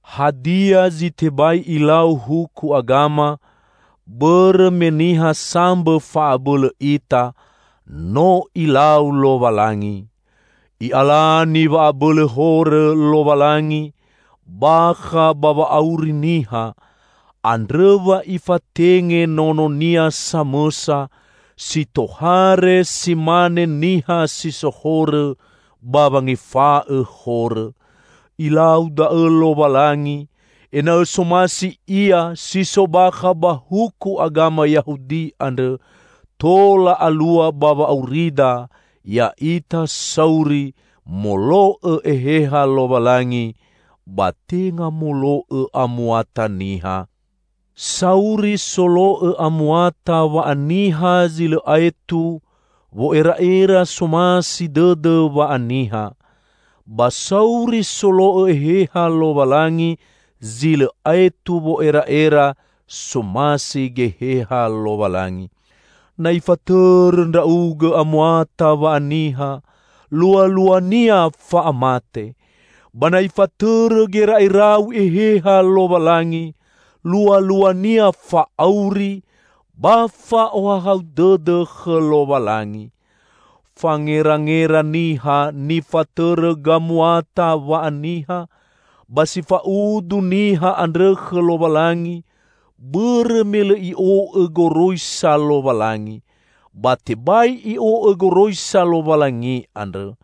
Hadia zi tebai ilau huku agama, bõrõ me niha sambõ fa'abõlõ ita, no Ilau Lowalangi. I'alani wa'abõlõ horõ Lowalangi bakha ba wa'auri niha, andrõ wa Ifatenge Nono-Nia samõsa, si tohare si mane niha si so horõ, ba wangefa'õ horõ. Ilau da'õ Lowalangi ena'õ somasi Ia si so bakha ba huku agama Yahudi andrõ, tola alua ba wa'aurida ya'ita sauri molo'õ Eheha Lowalangi, ba tenga molo'õ amuata niha. Sauri solo'õ amuata wa'aniha zi lõ aetu wo'era'era somasi dõdõ wa'aniha. Ba sauri solo'õ Eheha Lowalangi zi lõ aetu wo'era'era somasi Geheha Lowalangi. Na ifatõrõ ndra'ugõ amuata wa'aniha, lualuania fa'amate. Ba na ifatõrõ gera'erau Eheha Lowalangi, lualuania fa'auri ba fa'ohahau dõdõ khõ Lowalangi. Fangerangera niha nifatõrõ gamuata wa'aniha, ba si fa'udu niha andrõ khõ Lowalangi; bõrõ me lõ i'o'õ goroisa Lowalangi; ba tebai i'o'õ goroisa Lowalangi andrõ.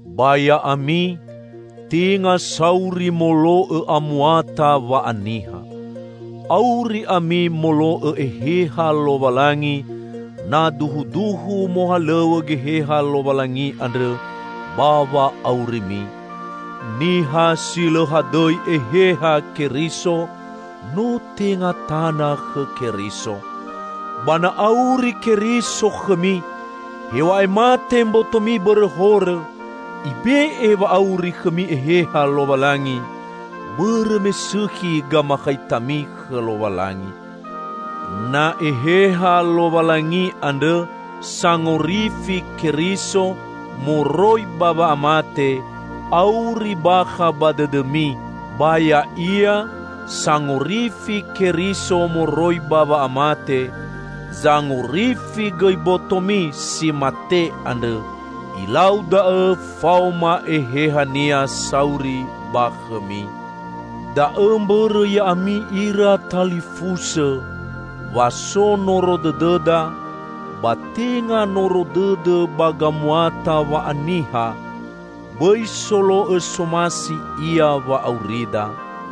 Ba ya'ami, tenga sauri molo'õ amuata wa'aniha. Auri ami molo'õ Eheha Lowalangi -- na duhuduhu mohalõw̃õ Geheha Lowalangi andrõ ba wa'aurimi. Niha si lõ hadõi Eheha Keriso, no tenga tana khõ Keriso. Ba na auri Keriso khõmi, hew̃a'ae mate mbotomi bõrõ horõ, Ibe'e wa'auri khõmi Eheha Lowalangi, bõrõ me sõkhi gamakhaitami khõ Lowalangi. Na Eheha Lowalangi andrõ, sangorifi Keriso moroi ba wa'amate, auri bakha ba dõdõmi, ba Ya'ia, sangorifi Keriso moroi ba wa'amate, zangorifi gõi botomi si mate andrõ. Ilau da'õ faoma Eheha-Nia sauri ba khõmi. Da'õ mbõrõ ya'ami ira talifusõ, wa so noro dõdõda; ba tenga noro dõdõ ba gamuata wa'aniha; bõi solo'õ somasi ia wa'aurida.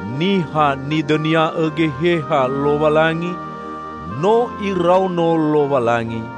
Niha nidõnia'õ Geheha Lowalangi no iraono Lowalangi.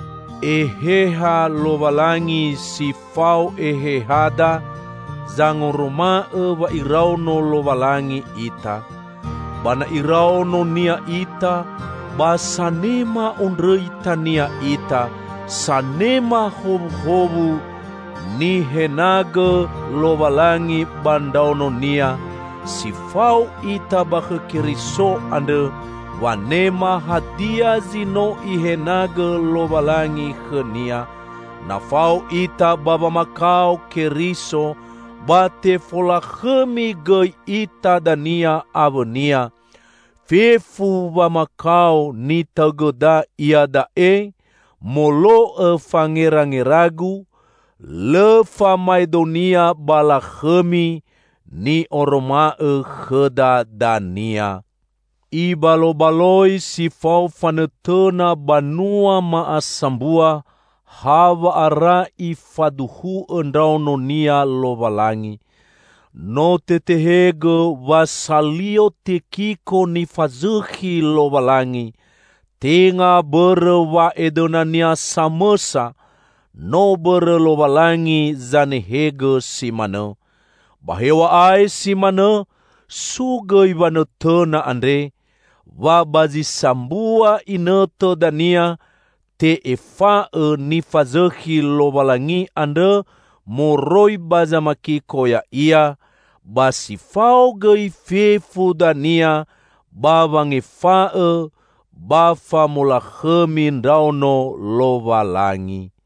Eheha Lowalangi si fao ehehada zangoroma'õ wa iraono Lowalangi ita. Ba na iraono-Nia ita, ba sanema ondrõita-Nia ita, sanema howuhowu nihenagõ Lowalangi ba ndraono-Nia; si fao ita ba khõ Keriso andrõ wanema hadia zi no Ihenagõ Lowalangi khõ-Nia; na fao ita ba wamakao Keriso, ba tefolakhõmi gõi ita dania awõ-Nia. Fefu wamakao nitaõgõda iada'e, molo'õ fangerangeragu, lõ famaedonia ba lakhõmi ni'oroma'õ khõda dania. Ibalobaloi si fao fanõtõna banua ma'asambua hawa'ara Ifaduhu'õ ndraono-Nia Lowalangi. No tetehegõ wa salio tekiko nifazõkhi Lowalangi, tenga bõrõ wa'edõnania samõsa, no bõrõ Lowalangi zanehegõ si manõ. Ba hew̃a'ae si manõ so gõi wanõtõna andre: wa ba zi sambua inõtõ dania te'efa'õ nifazõkhi Lowalangi andrõ moroi ba zamakiko ya'ia ba si fao gõi fefu dania ba wangefa'õ ba famolakhõmi ndraono Lowalangi.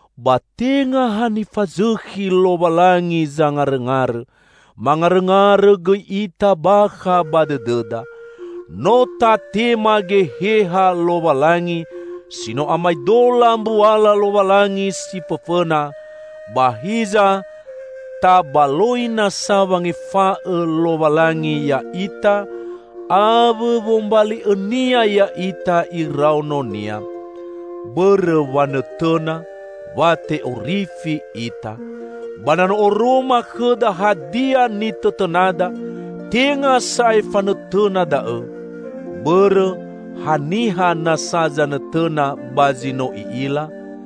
Ba tenga ha nifazõkhi Lowalangi zangarõngarõ; mangarõngarõ gõi ita bakha ba dõdõda. No tatema Geheha Lowalangi si no amaedola mbuala Lowalangi si fõfõna, ba hiza tabaloi nasa wangefa'õ Lowalangi ya'ita awõ wombali'õ-Nia ya'ita iraono-Nia. Bõrõ wanõtõna, wa te'orifi ita. Ba na no oroma khõda hadia nitõtõnada, tenga sa'ae fanõtõna da'õ. Bõrõ, haniha nasa zanõtõna ba zi no i'ila?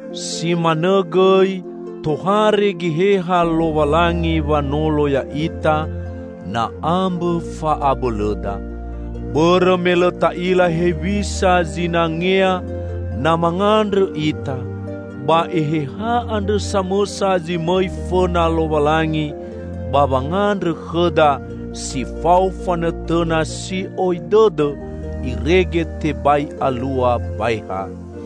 Si manõ gõi, tohare Geheha Lowalangi wanolo ya'ita na ambõ fa'abõlõda. Bõrõ me lõ ta'ila hewisa zinangea na mangandrõ ita; ba Eheha andrõ samõsa zi mõi fõna Lowalangi ba wangandrõ khõda si fao fanõtõna si'oi dõdõ irege tebai alua baeha.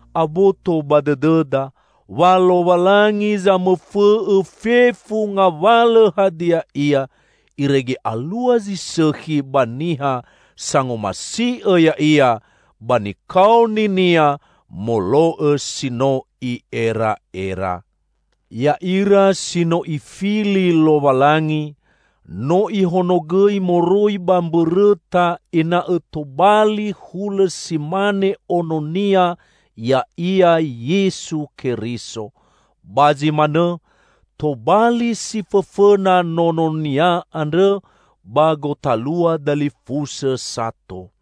Aboto ba dõdõda wa Lowalangi zamõfõ'õ fefu ngawalõ hadia ia, irege alua zi sõkhi ba niha sangomasi'õ Ya'ia ba nikaoni-Nia molo'õ si no I'era'era. Ya'ira si no Ifili Lowalangi, no Ihonogõi moroi ba mbõrõta ena'õ tobali hulõ si mane Ono-Nia, ya'ia Yesu Keriso. Ba zi manõ, tobali si fõfõna Nono-Nia andrõ ba gotalua dalifusõ sato.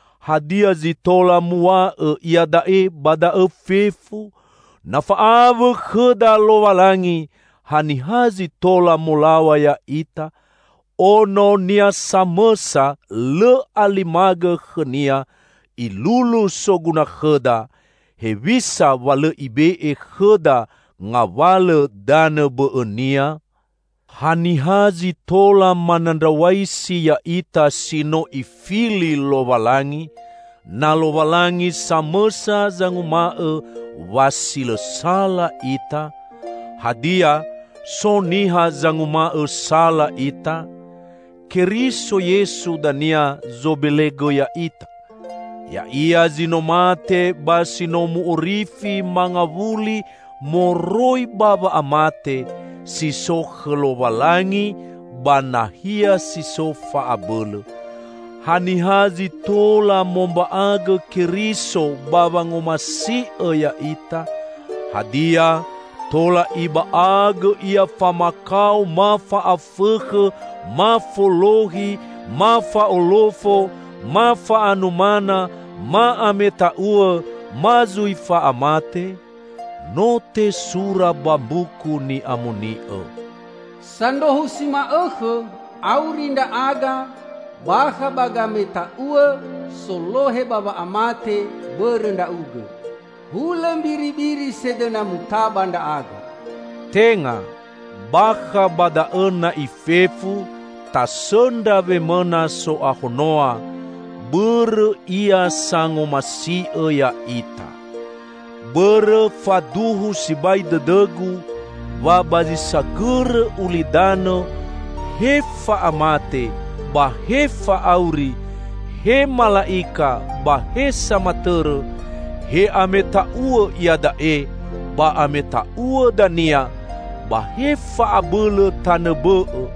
Hadia zi tola muw̃a'õ iada'e ba da'õ fefu? Na fa'awõ khõda Lowalangi, haniha zi tola molaw̃a ya'ita? Ono-Nia samõsa lõ alimagõ khõ-Nia Ilulu soguna khõda; hewisa wa lõ Ibe'e khõda ngawalõ danõ bõ'õnia? Haniha zi tola manandraw̃aisi ya'ita si no Ifili Lowalangi, na Lowalangi samõsa zanguma'õ wa si lõ sala ita? Hadia, so niha sanguma'õ sala ita? Keriso Yesu dania zobelegõ ya'ita! Ya'ia zi no mate ba si no mu'orifi mangawuli moroi ba wa'amate, si so khõ Lowalangi ba nahia si so fa'abõlõ. Haniha zi tola momba'agõ Keriso ba wangomasi'õ ya'ita? Hadia, tola iba'agõ Ia famakao ma fa'afõkhõ, ma folohi, ma fa'olofo, ma fa'anumana, ma ameta'uõ, ma zui fa'amate? No tesura ba Mbuku Ni'amoni'õ, "Sandrohu si ma'õkhõ auri ndra'aga bakha ba gameta'uõ solohe ba wa'amate bõrõ Ndra'ugõ. Hulõ mbiribiri sedõna mutaba ndra'aga." Tenga! Bakha ba da'õ na'i fefu tasõndra wemõna so'ahonoa, bõrõ Ia sangomasi'õ ya'ita! Bõrõ faduhu sibai dõdõgu wa ba zi sagõrõ ulidanõ, he fa'amate ba he fa'auri, he mala'ika ba he samatõrõ, he ameta'uõ iada'e ba ameta'uõ dania ba he fa'abõlõ tanõ bõ'õ;